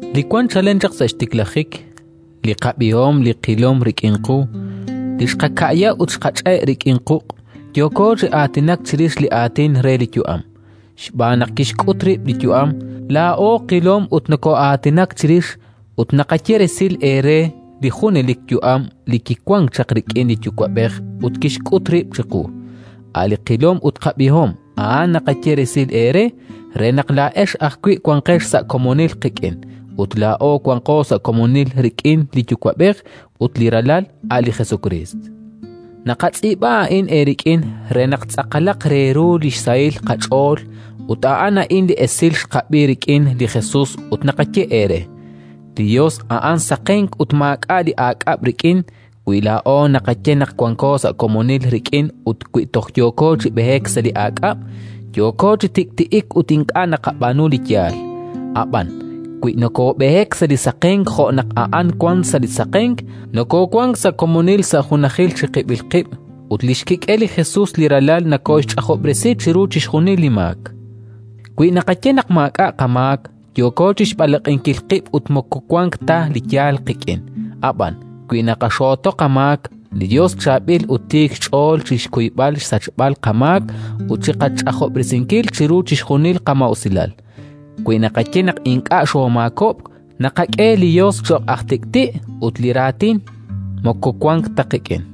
Li wank chalen chaq sa' xtiklajik, li qab'ihom, li qilom rik'in qu, li xqaka'ya ut xqach'e' rik'in quq' —yooko chi aatinak chirix li Aatin re li yu'am, xb'aan naq kixk'ut rib' li yu'am: laa'o qilom ut nokoo'aatinak chirix, ut naqaye resil eere li junelik yu'am li kiwank chaq rik'in li Yuwa'b'ej ut kixk'ut rib' chiqu--, a' li qilom ut qab'ihom, a'an naqaye resil eere, re naq laa'ex ajwi' wanqex sa' komonil qik'in. Ut laa'o wanko sa' komonil rik'in li Yuwa'b'ej ut li Ralal, a' li Jesukriist. Naqatz'iib'a a'in eerik'in re naq tz'aqalaq re ru li xsahil qach'ool. Ut a'an a'in li esil xqab'i rik'in li Jesus ut naqaye eere: li Yos a'an saqenk ut maak'a' li aak'ab' rik'in. Wi laa'o naqaye naq wanko sa' komonil rik'in ut wi toj yooko chi b'eek sa' li aak'ab', yooko chi tik'ti'ik ut ink'a' naqab'aanu li yaal. Ab'an wi nokoob'eek sa' li saqenk jo' naq A'an wank sa' li saqenk, nokoowank sa' komonil sa' junajil chiqib'il qib' ut li xkik'el li Jesus li Ralal nokooxch'ajob'resi chiru chixjunil li maak. Wi naqaye naq maak'a' qamaak, yooko chi xb'alaq'inkil qib' ut moko wank ta li yaal qik'in. Ab'an wi naqaxooto li qamaak, li Yos chaab'il ut tiik xch'ool chi xkuyb'al xsachb'al qamaak ut chi qach'ajob'resinkil chiru chixjunil qamaa'usilal. Wi naqaye naq ink'a' xoomaakob'k, naqak'e li Yos cho'q aj tik'ti' ut li Raatin moko wank ta qik'in.